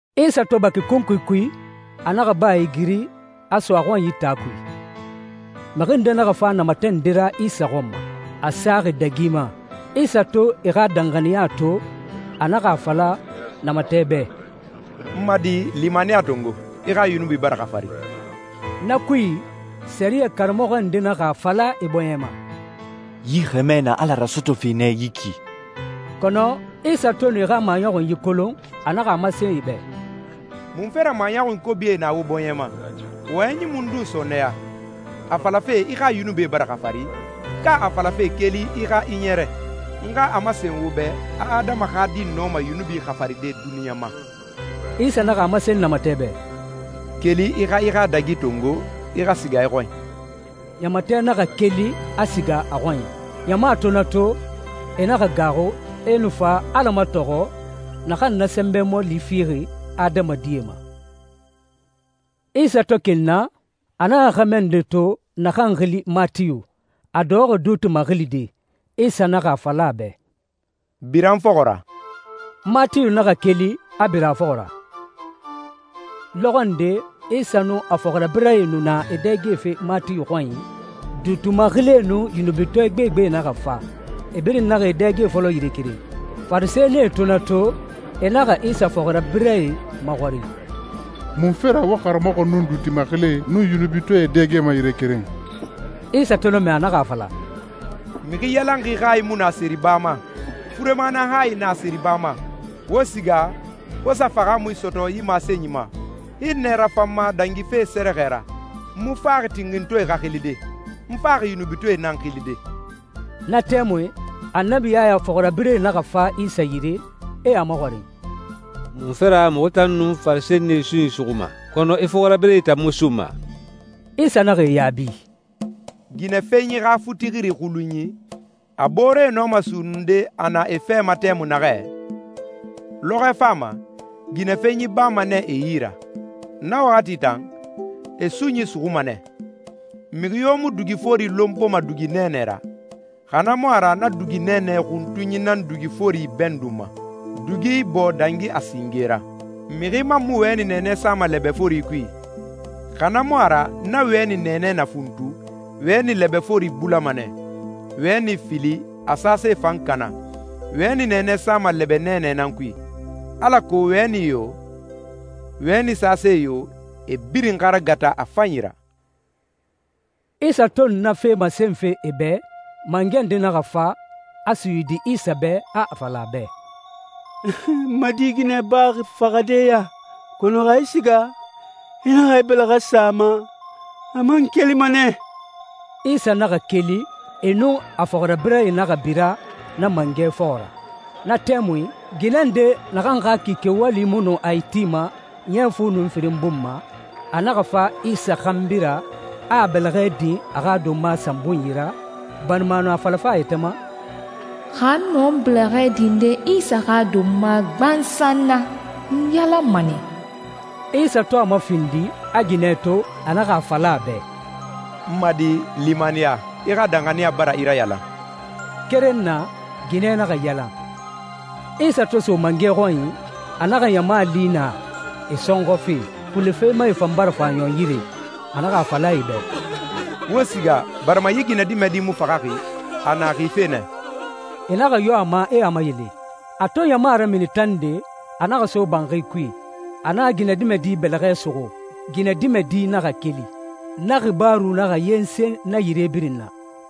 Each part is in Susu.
Isa to baki kunkui kui, a naxa baa igiri, a so a xɔnyi taa kui. Mixi ndee naxa fa namatɛ nde ra Isa xɔn ma, a saxi dagi ma. Isa to e xa danxaniya to, a naxa a fala namatɛ bɛ, «N ma di, limaniya tongo, i xa yunubie bara xafari.» Na kui, sɛriyɛ karamɔxɔ ndee naxa a fala e bɔɲɛ ma, «Yi xɛmɛ na Ala rasɔtɔfe nɛ yi ki.» Kɔnɔ Isa to nu e xa maɲɔxunyi kolon, a naxa a masen e bɛ, «Munfe ra maɲɔxunyi kobie na wo bɔɲɛ ma? Wɔyɛnyi mundun sɔɔnɛya, a falafe ‹I xa yunubie bara xafari,› ka a falafe ‹Keli, i xa i ɲɛrɛ›? N xa a masen wo bɛ a Adama xa Di nɔma yunubi xafaride duniɲa ma.» Isa naxa a masen namatɛ bɛ, «Keli, i xa i xa dagi tongo, i xa siga i xɔnyi.» Namatɛ naxa keli, a siga a xɔnyi. Ɲama to na to, e naxa gaaxu, e nu fa Ala matɔxɔ, naxan na sɛnbɛ mɔɔli fixi adamadie ma. Isa to keli na, a naxa xɛmɛ nde to naxan xili Matiyu, a dɔxɔxi duuti maxilide. Isa naxa a fala a bɛ, «Bira n fɔxɔ ra.» Matiyu naxa keli, a bira a fɔxɔ ra. Lɔxɔ nde Isa nun a fɔxirabirɛe nu na e dɛgefe Matiyu xɔnyi. Duuti maxilie nun yunubitɔɛ gbegbe naxa fa, e birin naxa e dɛge fɔlɔ yire keren. Farisɛnie to na to, e naxa Isa fɔxirabirɛe maxɔrin, «Munfe ra wo karamɔxɔ nun duuti maxilie nun yunubitɔɛe e dɛgema yire keren?» Isa to na mɛ, a naxa a fala, «Mixi yalanxi hayi mu na seriba ma. Furema nan hayi na seriba ma. Wo siga, wo sa fahaamui sɔtɔ yi masenyi ma, ‹Hinnɛ rafan n ma dangife sɛrɛxɛ ra.› N mu faxi tinxintɔɛe xa xilide. N faxi yunubitɔɛe nan xilide.» Na tɛmui Annabi Yaya fɔxirabirɛe naxa fa Isa yire, e a maxɔrin, «Munfe ra muxu tan nun Farisɛnie sunyi suxuma, kɔnɔ i fɔxirabirɛe tan mu sunma?» Isa naxa e yaabi, «Ginɛfenyi xa futixiri xulunyi, a booree nɔma sunnunde a na e fɛ ma tɛmui naxɛ? Lɔxɔɛ fama, ginɛfenyi bama nɛ e yi ra. Na waxati tan, e sunyi suxuma nɛ. Mixi yo mu dugi fori lonpoma dugi nɛɛnɛ ra, xa na mu a ra na dugi nɛɛnɛ xuntunyi nan dugi fori ibɛndunma, dugi ibɔɔ dangi a singe ra. Mixi man mu wɛni nɛɛnɛ sama lɛbɛ fori kui, xa na mu a ra na wɛni nɛɛnɛ na funtu, wɛni lɛbɛ fori bulama nɛ, wɛni fili, a sase fan kana. Wɛni nɛɛnɛ sama lɛbɛ nɛɛnɛ nan kui, alako wɛni yo, wɛni sase yo, e birin xa ragata a fanyi ra.» Isa to nu na na fee masenfe e bɛ, mangɛ nde naxa fa, a suyidi Isa bɛ, a a fala a bɛ, «N ma di ginɛ baxi faxade ya, kɔnɔ xa i siga, i naxa i bɛlɛxɛ sa a ma, a man kelima nɛ.» Isa naxa keli, e nun a fɔxirabirɛe naxa bira na mangɛ fɔxɔ ra. Na tɛmui, ginɛ nde naxan xa kike wali mu nu a itima ɲɛ fu nun firin bun ma, a naxa fa Isa xanbi ra, a a bɛlɛxɛ din a xa donma sanbunyi ra, barima a nu a falafe a yɛtɛ ma, «Xa n nɔ n bɛlɛxɛ dinde Isa xa donma gbansan na, n yalanma nɛ.» Isa to a mafindi, a ginɛ to, a naxa a fala a bɛ, «N ma di, limaniya, i xa danxaniya bara i rayalan.» Keren na, ginɛ naxa yalan. Isa to so mangɛ xɔnyi, a naxa ɲama li naa, e sɔnxɔfe, xule femae fan bara fa ɲɔn yire. A naxa a fala e bɛ, «Wo siga, barima yi ginɛdimɛdi mu faxaxi. A na xife nɛ.» E naxa yo a ma, e a mayele. A to ɲama ramini tande, a naxa so banxi kui. A naxa ginɛdimɛdi bɛlɛxɛ suxu, ginɛdimɛdi naxa keli. Na xibaaru naxa yensen na yire birin na.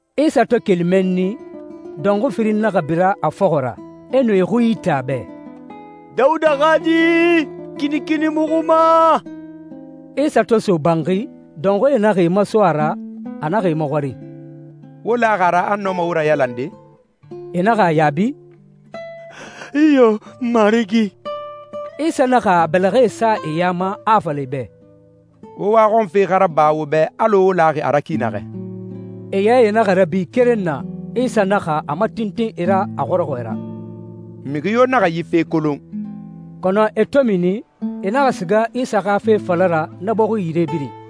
Isa to keli mɛnni, dɔnxui firin naxa bira a fɔxɔ ra, e nu e xui ite a bɛ, «Dawuda xa Di, kinikini muxu ma!» Isa to so banxi, dɔnxuie naxa e maso a ra. A naxa e maxɔrin, «Wo laxi a ra a n nɔma wo rayalande?» E naxa a yaabi, «Iyo, Marigi.» Isa naxa a bɛlɛxɛe sa e ya ma, a a fala e bɛ, «Wo waxɔnfe xa raba wo bɛ alɔ wo laxi a ra ki naxɛ.» E yae naxa rabi keren na. Isa naxa a matintin e ra a xɔrɔxɔɛ ra, «Mixi yo naxa yi fe kolon.» Kɔnɔ e to mini, e naxa siga Isa xa fe fala ra na bɔxi yire birin.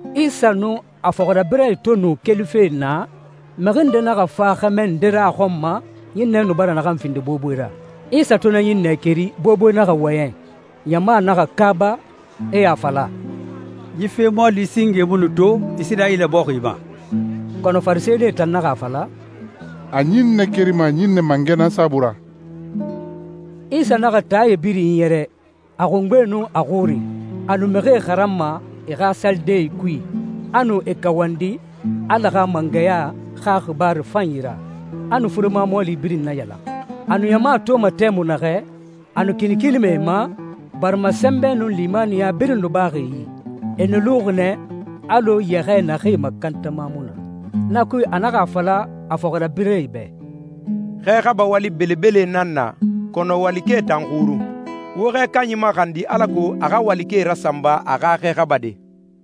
Isa nun a fɔxirabirɛe to nu kelife naa, mixi nde naxa fa xɛmɛ nde ra a xɔn ma ɲinnɛ nu bara naxan findi boboe ra. Isa to na ɲinnɛ keri, boboe naxa wɔyɛn. Ɲama naxa kaaba, e a fala, «Yi fe mɔɔli singe mu nu to Isirayila bɔxi ma.» Kɔnɔ Farisɛnie tan naxa a fala, «A ɲinnɛe kerima ɲinnɛ mangɛ nan saabui ra.» Isa naxa taae birin iɲɛrɛ, a xungbe nun a xuri. A nu mixie xaranma e xa salidee kui, a nu e kawandi Ala xa mangɛya xa xibaaru fanyi ra, a nu furema mɔɔli birin nayalan. A nu ɲama toma tɛmui naxɛ, a nu kinikinima e ma, barima sɛnbɛ nun limaniya birin nu baxi e yi. E nu luxi nɛ alɔ yɛxɛɛ naxee makantama mu na. Na kui, a naxa a fala a fɔxirabirɛe bɛ, «Xɛ xaba wali belebele nan na, kɔnɔ walikɛe tan xurun. Wo xɛ kanyi maxandi alako a xa walikɛe rasanba a xa xɛ xabade.»